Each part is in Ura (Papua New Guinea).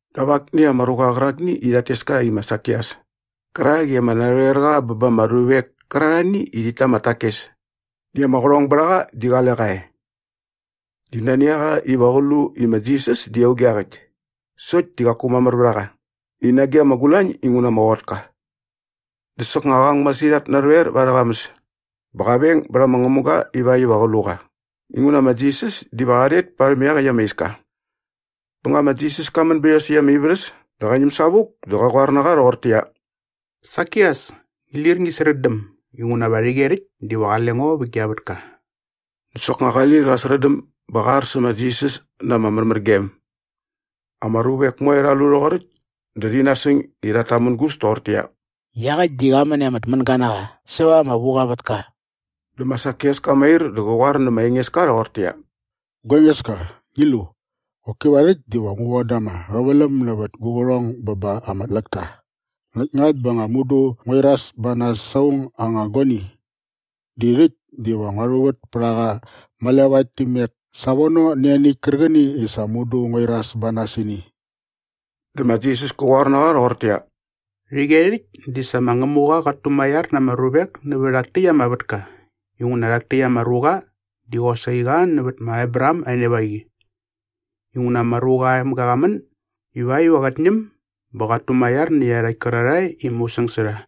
dap akni ama ruqa qärakni i rhat tes ka i ma Sakias kärakni i ama narhoerqa bä ba ama ruvek kärarhani i rhit ta ama takes näkt ama qärhong bät a qa di qale qa e. Di nani a qa iva qä lu i ma Jisas di auge iaqäkt sokt di qaku mamär vät a qa i nage ama gulañ inguna ama qot ka. Dä soknga qa ang masirhat narhoer va arhä qamäs bä qa veng bät ama ngämuga ivakt iva qä lu qa inguna ma Jisas diva qa rhet parhäm iaqäkt ama iska. Bä nga ma Jisas ka män bät iosäkt ama ivärhäs dä qa ñäm savuk dä qä qoar na qa rhoqortäqyia, “Sakias, ngi lir ngi srätdäm inguna va rhäqyerhäkt diva qale ngo vä gia vätka.” Dä soknga qa lir qa srätdäm bä qa ar sä ma Jisas na ama märmärgem. Ama ruvek moe rha lu rhoqoräkt dä rhi nasäng i rhat tamängus toqortäqyia, “Iaqäkt di qa män i ama tmänga na qa säva ama vuqa aa vätka.” Dä ma Sakias ka mair dä qä qoar nä ma Engeska rhoqortäqyia, “Gua Engeska, ngi lu! Qoki va rhäkt diva ngu voda ama qäväläm nävät gu qärhong bä ba ama tläkta näkt ngakt bä nga mudu ngua iras ba nas sa aung aa anga guani di rhäkt diva ngua rhuvät pät a qa malevaet nä imek savono nä ianiäkt kärqäni i sa mudu ngua iras ba nas sä ini.” Dä ma Jisas kä qoar na qa rhoqortäqyia, “Rhäqyerhäkt di sa ma Ngämuqa qat tumaiar na ama ruvek nävä rhak täkt ama vätka inguna rhak täkt ama ruqa di qosaqi qa nävät ma Abraham aa enevaqi. Inguna ma Ruqa aa Emga qa män ivakt iva qät ñäm bä qat tumaiar nä iarhakt kärarhae i musäng sä rha.”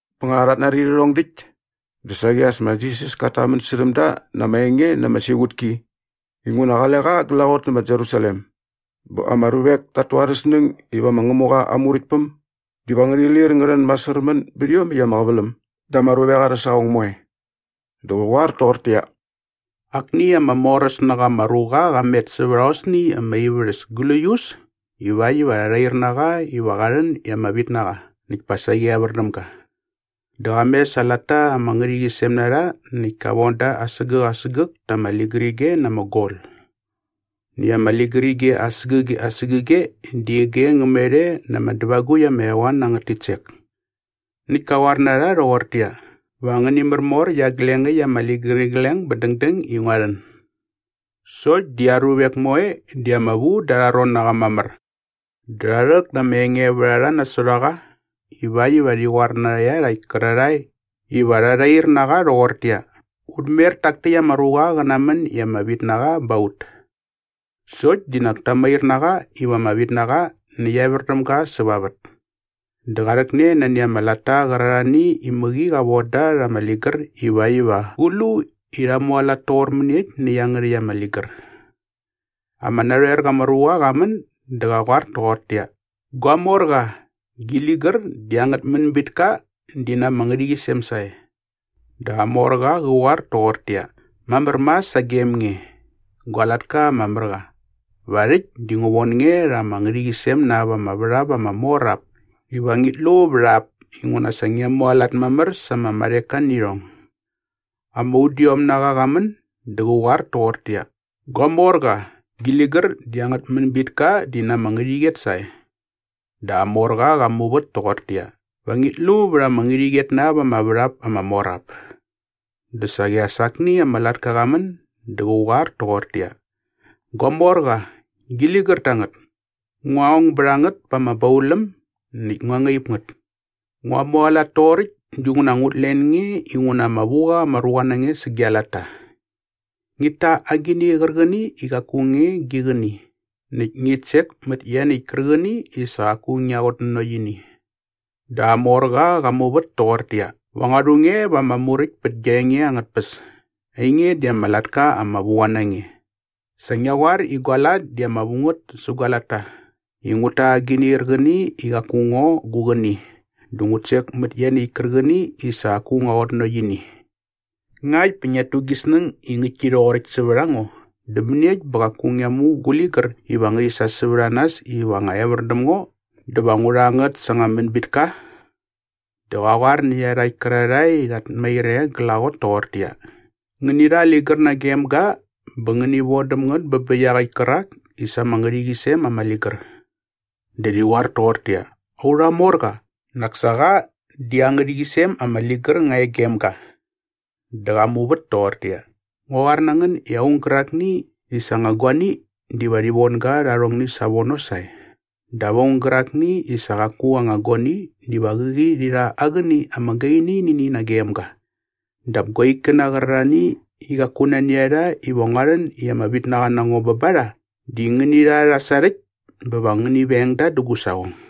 Bä nga rhat nari rhärhong däkt dä saqi as ma Jisas kat tamän särhäm da na ama enge na ama siqutki inguna qale qa glaqot nä ma Jerusalem bä ama ruvek tat tu arhä snäng iva ma Ngämuqa aa Muräktpäm diva ngärhi lir ngä rhän masärmän bät iomäkt ama qäväläm da ama ruvek arhä saqong moe. Dä qä qoar toqortäqyia, “Akni ama moräs na qa ama ruqa qa met sävät aosni ama ivärhäs gläius ivakt iva rha rhair na qa iva qa rhän i ama vitnaqa näkt pa saqi evär däm ga. Dä qa mes aa latta ama ngärhäqyisem na rha näkt ka von da asägäk asägäk ta ama ligärige na ama gol. Näkt ama ligärige asägäge asägäge di ige ngä met e na ama dävagukt ama eqoan angät titsek. Näkt ka qoar na rha rhoqortäqyia, ‘Va ngäni märmor iaglengäkt ama ligärigleng bä dängdäng i ngua rhän.’” “Sokt di aa ruvek moe di ama vu da arha ron na qa mamär dä rha rhäk na ama engevärharha nasot a qa ivakt iva rhi qoar nä iarhakt kärarhae iva rha rhair na qa rhoqortäqyia, ‘Ut mer tak täkt ama ruqa qä namän iva ama vitnaqa ba ut.’” “Sokt di nak ta mair na qa iva ama vitnaqa näkt evär däm ga säva aa vät. Dä qa rhäkne nani ama latta qärarhani i mäqi qa von da rha ama ligär ivakt iva qä lu i rha mualat toqor mäniekt nä iangärhäkt ama ligär.” “Ama narhoerqa ama ruqa qa män dä qä qoar toqortäqyia, ‘Gua morqa, gi ligär di angät mänbitka di na ama ngärhäqyisem sae.’” “Dä aa morqa qä qoar toqortäqyia, ‘Mamär mas sagem nge, gua latka ama mär qa. Va rhäkt di ngu von nge rha ama ngärhäqyisem na ap ama värhap ama mor ap iva ngit lu vät ap inguna sa ngia mualat mamär sa ama marheka nä irhong.’” “Ama udiomnaqa qa män dä qä qoar toqortäqyia, ‘Gua morqa, gi ligär di angät mänbitka di na ama ngärhäqyet sae.’” “Dä aa morqa qa muvät toqortäqyia, ‘Va ngit lu vät ama ngärhäqyet na ap ama värhap ama mor ap.’” “Dä saqi as akni ama latka qa män dä qä qoar toqortäqyia, ‘Gua morqa, gi ligär tangät. Ngua ong bät a ngät pa ama bauläm näkt ngua ngaip ngät. Ngua mualat toqoräkt dinguna ngut len nge inguna ama vu qa ama ruqa na nge sä gia latta. Ngit ta agini qärqäni i qaku nge gi qäni näkt ngit sek mät ianiäkt kärqäni i sa qaku ngia qutnanokt ini.’” “Dä aa morqa qa muvät toqortäqyia, ‘Va ngua rhu nge va ama muräkt pät gia enge angät tpäs. Ainge di ama latka ama vu qa na nge. Sa ngia qoar i gua lat di ama vu ngät sä gua latta i ngut ta agini qärqäni i qaku ngo gu qäni dä ngut sek mät ianiäkt kärqäni i sa qaku ngua qutnanokt ini. Ngakt bä ngiat tu gi snäng i ngäktki rhoqoräkt sävät a ngo dä mäniekt bä qaku ngia mu gu ligär iva ngärhi sa sävät a nas iva nga evär däm ngo dä va ngu rha ngät sa anga mänbitka?’” “Dä qä qoar nä iarhakt kärarhae i rhat mair e glaqot toqortäqyia, ‘Ngäni rha aa ligär nagem ga bä ngäni vodäm ngät bä bä iaqäkt kärak i sa ama ngärhäqyisem ama ligär.’” “Dä rhi qoar toqortäqyia, ‘Aurha morqa, nak sa qa di aa ngärhäqyisem ama ligär nga e gem ga!’” “Dä qa muvät toqortäqyia, ‘Ngu qoar na ngän i aung gärakni i sa aa anga guani diva rhi von ga rha arhongni savono sae. Dap aung gärakni i sa qaku aa anga guani diva qäqi rhi rha aa qäni ama gaini nä ini nagem ga. Dap gua ikkäna qärarhani i qaku nani a rha iva ngua rhän i ama vitnaqa na ngo bä ba rha di ngäni rha rha sarhäkt bä va ngäni veng da dä gu saqong.’”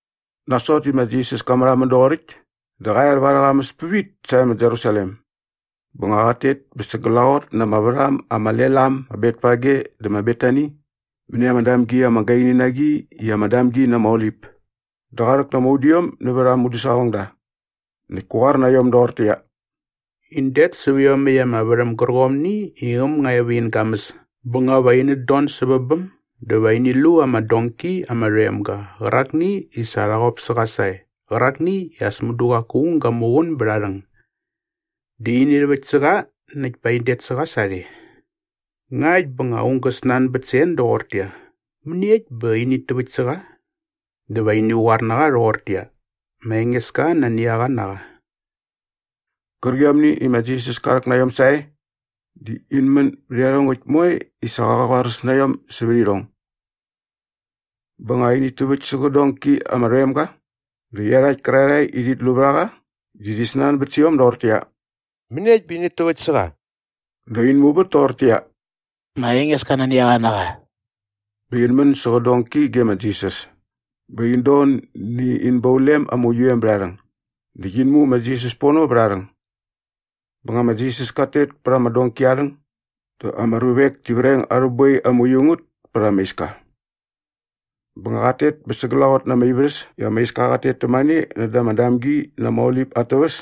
Nasot i ma Jisas ka märhamän doqoräkt dä qa er va arhä qamäs pävit sae ma Jerusalem. Bä nga qat tet bä sa glaqot na ama värham ama lel am ma Betfage dä ma Betani mäni ama damgi ama gaini na qi ama Damgi na ama Olip dä qa rhäk na ama udiom nävät aa mudäsaqongda näkt kä qoar na iom doqortäqyia, “In det säp iomäkt ama värhäm gärqomni i äm nga e vä in gamäs bä nga va inät don sävä bäm dä va ini lu ama donki ama rhoem ga qärakni i sa rha qop sä qa sae qärakni i as mudu qaku aung ga muqun bät aa rhäng. Dä ini rhäväkt sä qa näkt pa in det sä qa sarhe. Ngakt bä nga aung gä snanbät sä en doqortäqyia, ‘Mäniekt bä init täväkt sä qa?’ dä va ini qoar na qa rhoqortäqyia, ‘Ma Engeska nani a qa na qa.’” Qärqiomni i ma Jisas ka rhäk na iom sae di in män bät iarhongäkt moe i sa qa qoaräs na iom sävät irhong. Bä nga init täväkt sä qä donki ama rhoem ga dä iarhakt kärarhae i rhit lu vät a qa di rhi snanbät sä iom doqortäqyia, “Mäniekt bä init täväkt sä qa?” Dä in muvät toqortäqyia, “Ma Engeska nani a qa na qa.” Bä in män sä qä donki ge ma Jisas bä in don nä in baulem ama uiu em bät aa rhäng näkt in mu ma Jisas pono vät aa rhäng. Bä nga ma Jisas kat tet pät ama donki aa rhäng dä ama ruvek ti vreng arhä boi ama uiu ngät pät ama iska. Bä nga qat tet bä sa glaqot na ama ivärhäs i ama iska qat tet tämane näda ama Damgi na ama Olip at täväs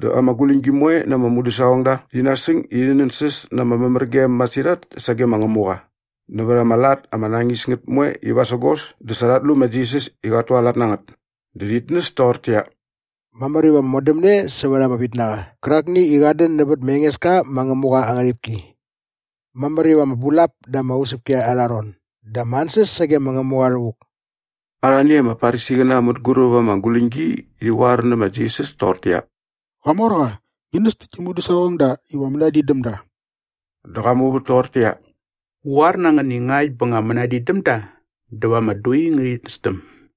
dä ama guläñgi moe na ama mudäsaqongda rhi nasäng i rhi nänsäs na ama märmärgem masirhat sage ma Ngämuqa nävät ama lat ama nañis ngät moe i vasägos dä sa rhat lu ma Jisas i qat tualat na ngät dä rhit näs toqortäqyia, “Mamär iva ama modämne sävät ama vitnaqa qärakni i qat dän nävät ma Engeska ma Ngämuqa aa ngärhipki.” “Mamär iva ama bulap da ama usäpki arha ron dä ama ansäs sage ma Ngämuqa rhävuk!” Arhani ama Farisiqäna mänguräp ama guläñgi rhi qoar nä ma Jisas toqortäqyia, “Qamorqa, ngi näs tä gi mudäsaqongda iva mänadin däm da!” Dä qa muvät toqortäqyia, “Ngu qoar na ngän i ngakt bä nga mänadin däm da dä va ama dui ngärhit nästäm.”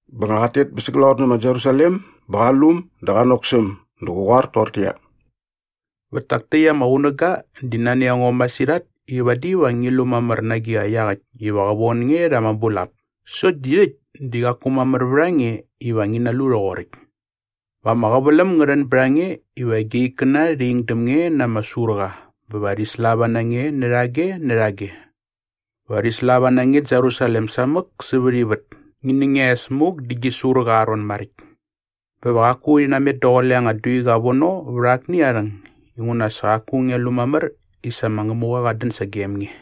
Bä nga qat tet bä sa glaqot nä ma Jerusalem bä qa lu äm dä qa nok sä äm. Dä qä qoar toqortäqyia, “Vät tak täkt ama qunäga di nani a ngo masirhat i vadi va ngi lu mamär na agiqa iaqäkt iva qä von nge rha ama bulap sokt di rhäkt di qaku mamär vät a nge iva ngi nalu rhoqoräkt. Va ama qäväläm ngä rhän bät a nge iva gia ikkäna rhi ing däm nge na ama surqa bä va rhi slava na nge närhage närhage. Va rhi slava na nge Jerusalem samäk sävät ivät ngi nä ngia es muk dä gi surqa aa ron maräkt. Bä va qaku rhi namet daqule anga duiqa vono vät akni aa rhäng inguna sa qaku ngia lu mamär i sa ma Ngämuqa qat dän sagem nge.”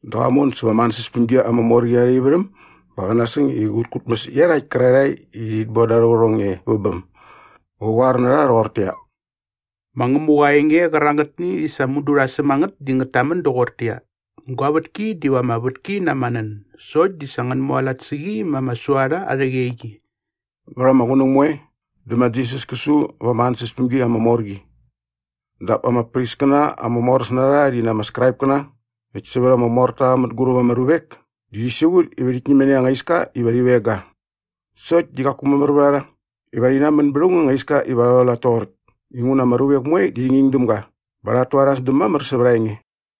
Dä qa mon säva ama ansäspämgi ama mor qi arha ivärhäm bä qa nasäng i qät kutmäs iarhakt kärarhae i rhit boda arhä qärhong e vä bäm. Qä qoar na rha rhoqortäqyia, “Ma Ngämuqa aa enge qärangätni i sa mudu rha säm a ngät di ngät tamän doqortäqyia, ‘Gua vätki diva ama vätki na ama nän sokt di sa ngän mualat sä qi ma ama suarha arhä qeqi.’” Vät ama qunäng moe dä ma Jisas kä su va ama ansäspämgi ama mor qi. Dap ama priskäna ama moräs na rha rhi na ama Skraipkäna näkt sävät ama morta mänguräp ama ruvek di rhi siqut i rhit ñäm nani anga iska iva rhi veng ga. Sokt di qaku mamär vät a rha iva rhi namän bät aung anga iska iva rha rhualat toqoräkt inguna ama ruvek moe di rhi nging däm ga bä rhat tu arha sdäm mamär sävät aa enge.